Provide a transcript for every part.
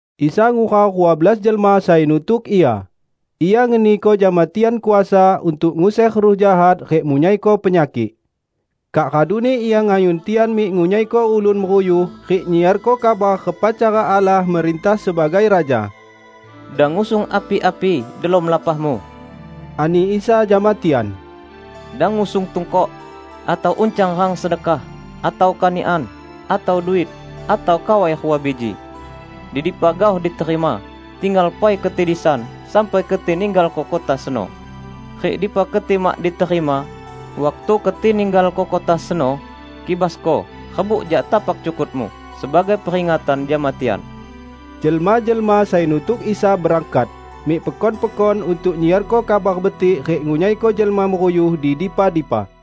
Isa ngurau rua belas jelma sai nutuk Ia, Ia ngeniko jama tian kuasa untuk nguser ruh jahat rik munyaiko penyakik. Kak raduni Ia ngayun tian mik ngunyaiko ulun meruyuh rik nyiarko kabar repa cara Allah merintah sebagai Raja. "Dang ngusung api-api delom lapahmu," ani Isa jama tian. "Dang ngusung tungkok, atau uncang rang sedekah, atau kanikan, atau duit, atau kawai rua biji. Di dipa gaoh diterima, tinggal pai keti disan sampai keti ninggalko kota seno. Rik di dipa keti mak diterima, waktu keti ninggalko kota seno, kibasko harbuk jak tapak cukutmu, sebagai peringatan jama tian." Jelma-jelma sai nutuk Isa berangkat, mik pekon-pekon untuk nyiarko Kabar Betik rik ngunyaiko jelma meruyuh di dipa-dipa.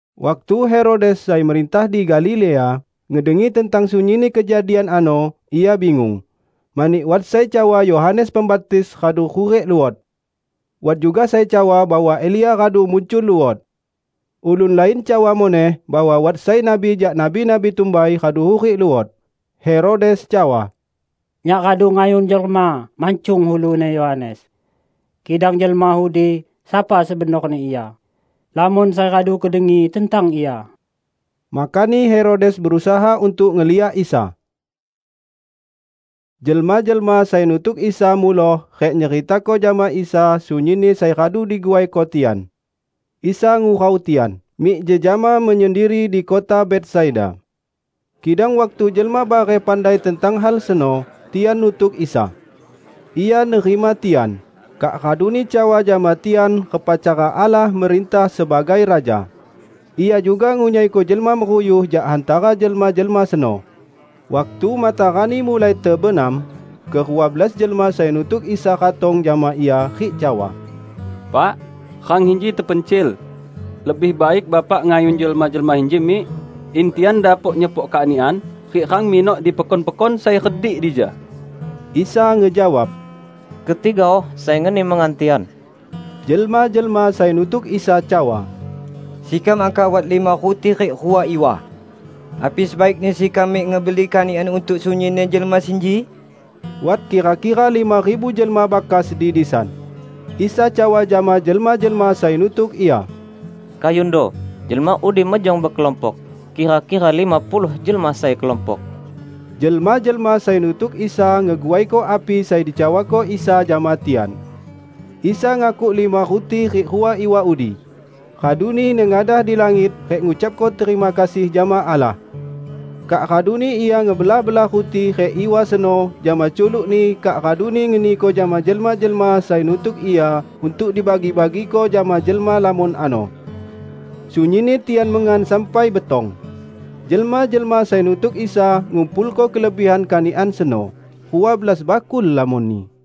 Waktu Herodes, sai merintah di Galilea, ngedengi tentang sunyinni kejadian ano, ia bingung. Mani wat sai cawa Yohanes Pembaptis radu hurik luot. Wat juga sai cawa bahwa Elia radu muncul luot. Ulun lain cawa muneh bahwa wat sai nabi jak nabi-nabi tumbai, radu hurik luot. Herodes cawa, "Nyak radu ngayun jelma mancung uluni Yohanes. Kidang Jelma udi, sapa sebenorni Ia? Lamon sai radu kudengi tentang Ia." Makani Herodes berusaha untuk ngeliak Isa. Jelma-jelma sai nutuk Isa muloh rik nyeritako jama Isa sunyinni sai radu diguaiko tian. Isa ngurau tian, mik jejama menyendiri di kota Betsaida. Kidang waktu jelma bareh pandai tentang hal seno, tian nutuk Isa. Ia nerima tian, kak raduni cawa jama tian repa cara Allah merintah sebagai Raja. Ia juga ngunyaiko jelma meruyuh jak hantara jelma-jelma seno. Waktu matarani mulai tebenam, ke rua belas jelma sai nutuk Isa ratong jama Ia rik cawa, "Pak, rang inji tepencil. Lebih baik Bapak ngayun jelma-jelma inji mik, in tian dapok nyepok kanikan rik rang minok di pekon-pekon sai redik dija." Isa ngejawab, "Keti gaoh sai ngeni mengan tian." Jelma-jelma sai nutuk Isa cawa, "Sekam angkah wat lima ruti rik rua iwa. Api sebaikni sekam mik ngebeli kanikan untuk sunyinni jelma sinji?" (Wat kira-kira lima ribu jelma bakas di disan.) Isa cawa jama jelma-jelma sai nutuk Ia, "Kayundo jelma udi mejong bekelompok, kira-kira lima puluh jelma sai kelompok." Jelma-jelma sai nutuk Isa ngeguaiko api sai dicawako Isa jama tian. Isa ngakuk lima ruti rik rua iwa udi, raduni nengadah di langit rik ngucapko terima kasih jama Allah. Kak raduni Ia ngebelah-belah ruti rik iwa seno jama culuk-Ni kak raduni ngeniko jama jelma-jelma sai nutuk Ia untuk dibagi-bagiko jama jelma lamon ano. Sunyinni tian mengan sampai betong. Jelma-jelma sai nutuk Isa ngumpulko kelebihan kanikan seno, rua belas bakul lamonni.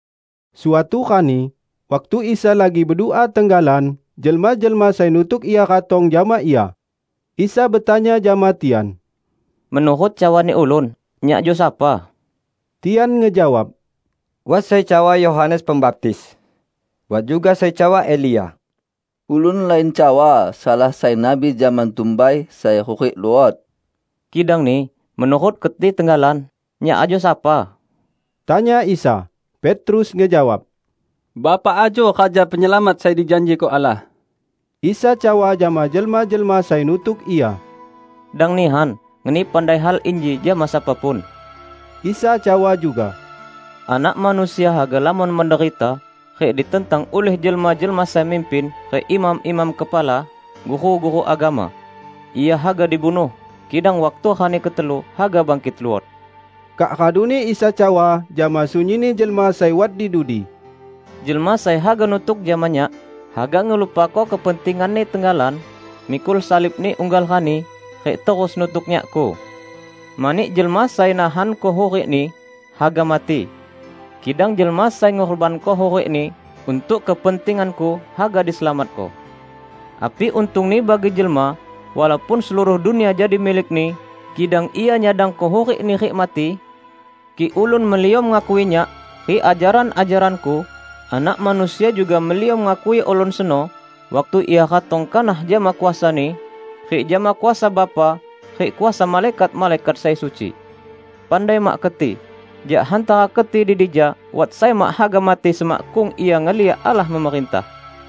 Suatu rani, waktu Isa lagi bedua tenggalan, jelma-jelma sai nutuk Ia ratong jama Ia. Isa betanya jama tian, "Menurut cawani ulun, Nyak ajo sapa?" Tian ngejawab, "Wat sai cawa Yohanes Pembaptis, wat juga sai cawa Elia, ulun lain cawa salah sai nabi zaman tumbai sai hurik luot." "Kidangni menurut keti tenggalan, Nyak ajo sapa?" tanya Isa. Petrus ngejawab, "Bapak ajo Raja Penyelamat sai dijanjiko Allah." Isa cawa jama jelma-jelma sai nutuk Ia, "Dang nihan ngeni pandai hal inji jama sapa pun." Isa cawa juga, "Anak Manusia haga lamon menderita rik ditentang ulih jelma-jelma sai mimpin rik imam-imam kepala, guru-guru agama. Ia haga dibunuh, kidang waktu rani ketelu haga bangkit luot." Kak raduni Isa cawa jama sunyinni jelma sai way di dudi, "Jelma sai haga nutuk jama Nyak, haga ngelupako kepentinganni tenggalan, mikul salibni unggal rani, rik terus nutuk Nyakku. Mani jelma sai nahanko hurikni, haga mati. Kidang jelma sai ngurbanko hurikni untuk kepentingan-Ku haga diselamatko. Api untungni bagi jelma walaupun seluruh dunia jadi milikni, kidang ia nyadangko hurikni rik mati? Kik ulun meliom ngakui Nyak rik ajaran-ajaran-Ku, Anak Manusia juga meliom ngakui ulun seno waktu Ia ratong kanah jama kuasa-Ni, rik jama kuasa Bapa rik kuasa malaikat-malaikat sai suci. Pandai mak keti: jak hantara keti di dija wat sai mak haga mati semakkung ia ngeliak Allah memerintah."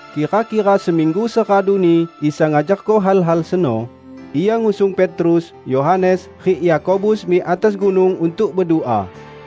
Kira-kira seminggu seraduni Isa ngajarko hal-hal seno, Ia ngusung Petrus, Yohanes, rik Yakobus mik atas gunung untuk bedua.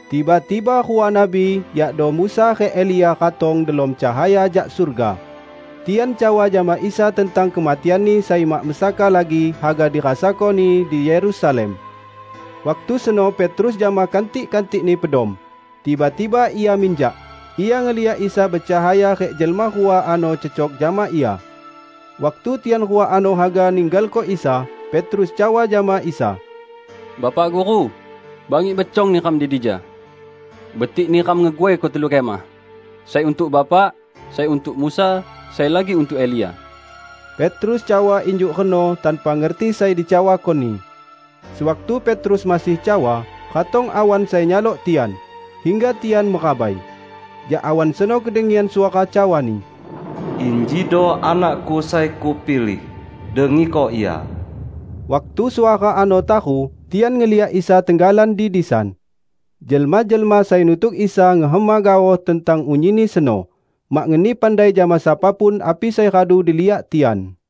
Tiba-tiba rua nabi, yakdo Musa rik Elia ratong delom cahaya jak surga. Tian cawa jama Isa tentang kematian-Ni sai mak mesaka lagi haga dirasako-Ni di Yerusalem. Waktu seno Petrus jama kantik-kantikni pedom, tiba-tiba ia minjak, ia ngeliak Isa becahaya rik jelma rua ano cecok jama Ia. Waktu tian rua ano haga ninggalko Isa, Petrus cawa jama Isa, "Bapak Guru, bangik becong neram di dija. Betik neram ngeguaiko telu kemah: Sai untuk Bapak, sai untuk Musa, sai lagi untuk Elia." (Petrus cawa injuk reno tanpa ngerti sai dicawakoni.) Sewaktu Petrus masih cawa, ratong awan sai nyalok tian, hingga tian merabai. Jak awan seno kedengian suara cawani, "Injido Anak-Ku sai Kupilih. Dengiko Ia!" Waktu suara ano taru, tian ngeliak Isa tenggalan di disan. Jelma-jelma sai nutuk Isa ngehema gaoh tentang unyinni seno, mak ngeni pandai jama sapa pun api sai radu diliak tian.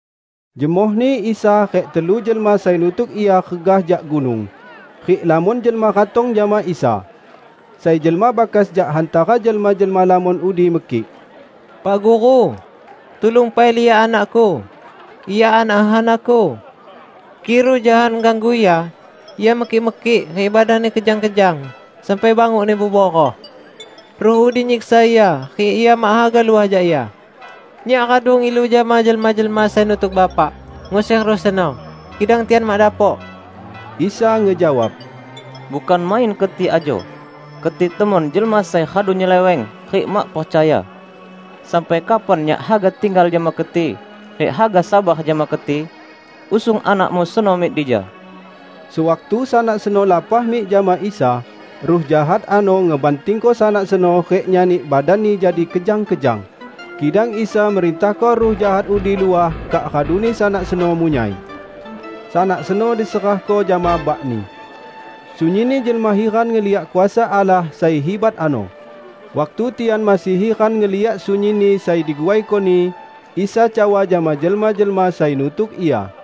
Jemohni Isa rik telu jelma sai nutuk Ia regah jak gunung, rik lamon jelma ratong jama Isa. Sai jelma bakas jak hantara jelma-jelma lamon udi mekik, "Pak Guru, tulung pai liak anakku -- ia anak hehanaku! Kik ruh jahat ngeganggu ia, ia mekik-mekik rik badanni kejang-kejang sampai bangukni beburoh. Ruh udi nyiksa ia rik ia mak haga luah jak ia. Nyak radu ngilu jama jelma-jelma sai nutuk Bapak nguser ruh seno, kidang tian mak dapok." Isa ngejawab, "Bukan main keti ajo! Keti temon jelma sai radu nyeleweng rik mak percaya! Sampai kapan Nyak haga tinggal jama keti rik haga sabar jama keti? Usung anakmu seno mik dija!" Sewaktu sanak seno lapah mik jama Isa, ruh jahat ano ngebantingko sanak seno rik nyani, badanni jadi kejang-kejang. Kidang Isa merintahko ruh jahat udi luah kak raduni sanak seno munyai. Sanak seno diserahko jama bakni. Sunyinni jelma hiran ngeliak kuasa Allah sai hibat ano. Waktu tian masih hiran ngeliak sunyinni sai diguaiko-Ni, Isa cawa jama jelma-jelma sai nutuk Ia,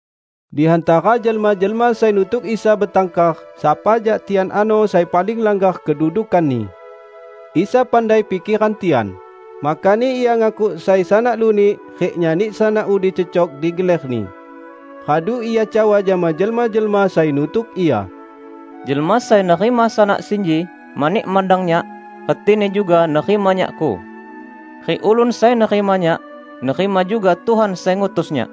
Di hantara jelma-jelma sai nutuk Isa betangkar sapa jak tian ano sai paling langgar kedudukanni. Isa pandai pikeran tian, makani Ia ngakuk sai sanak lunik rik nyani sanak udi cecok di geler-Ni. Radu Ia cawa jama jelma-jelma sai nutuk Ia, "Jelma sai nerima sanak sinji mani mandang Nyak, retini juga nerima Nyak-Ku. Rik ulun sai nerima Nyak, nerima juga Tuhan sai ngutus Nyak.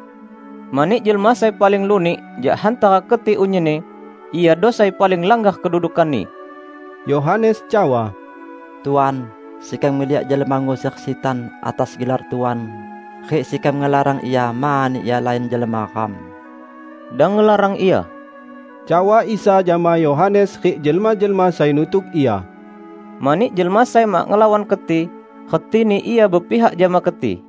Mani jelma sai paling lunik jak hantara keti unyinni, iado sai paling langgar kedudukanni!" Yohanes cawa, "Tuan, sekam ngeliak jelma nguser sitan atas gelar Tuan, rik sekam ngelarang ia, mani ia lain jelma ram." "Dang ngelarang ia," cawa Isa jama Yohanes rik jelma-jelma sai nutuk Ia, "mani jelma sai mak ngelawan keti, retini ia bepihak jama keti."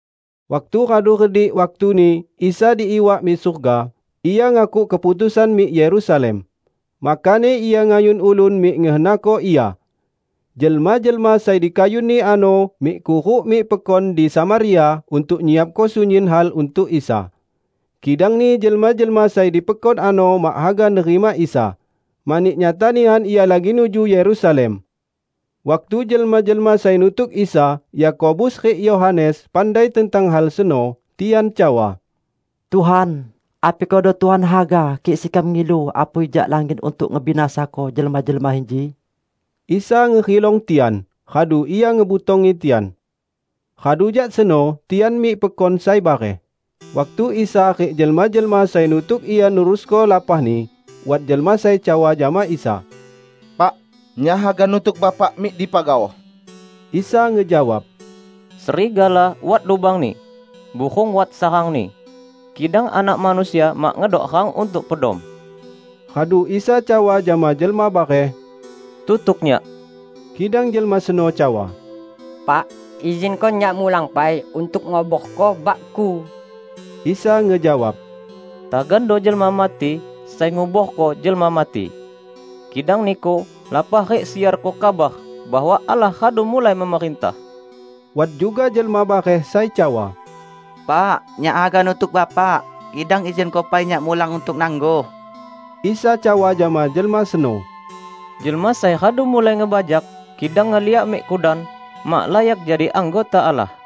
Waktu radu redik waktuni Isa diiwak mik surga, Ia ngakuk keputusan mik Yerusalem. Makani Ia ngayun ulun mik ngehenako Ia. Jelma-jelma sai dikayun-Ni ano mik kuruk mik pekon di Samaria untuk nyiapko sunyin hal untuk Isa. Kidangni jelma-jelma sai di pekon ano mak haga nerima Isa, mani nyata nihan Ia lagi nuju Yerusalem. Waktu jelma-jelma sai nutuk Isa, Yakobus rik Yohanes pandai tentang hal seno, tian cawa, "Tuhan, api kedo Tuhan haga, kik sekam ngilu apui jak langit untuk ngebinasako jelma-jelma inji?" Isa ngerilong tian, radu Ia ngebutongi tian. Radu jak seno tian mik pekon sai bareh. Waktu Isa rik jelma-jelma sai nutuk Ia nerusko lapahni, wat jelma sai cawa jama Isa, "Pak, nyak haga nutuk Bapak mik dipa gaoh!" Isa ngejawab, "Serigala wat lubangni, burung wat sarangni, kidang Anak Manusia mak ngedok rang untuk pedom." Radu Isa cawa jama jelma bareh, "Tutuk Nyak." Kidang jelma seno cawa, "Pak, izinko nyak mulang pai untuk nguborko bakku." Isa ngejawab, "Tagando jelma mati sai nguborko jelma mati. Kidang niku, lapah rik siarko kabar bahwa Allah radu mulai memerintah." Wat juga jelma bareh sai cawa, "Pak, nyak haga nutuk Bapak, kidang izinko pai nyak mulang untuk nangguh." Isa cawa jama jelma seno, "Jelma sai radu mulai ngebajak, kidang ngeliak mik kudan, mak layak jadi anggota Allah."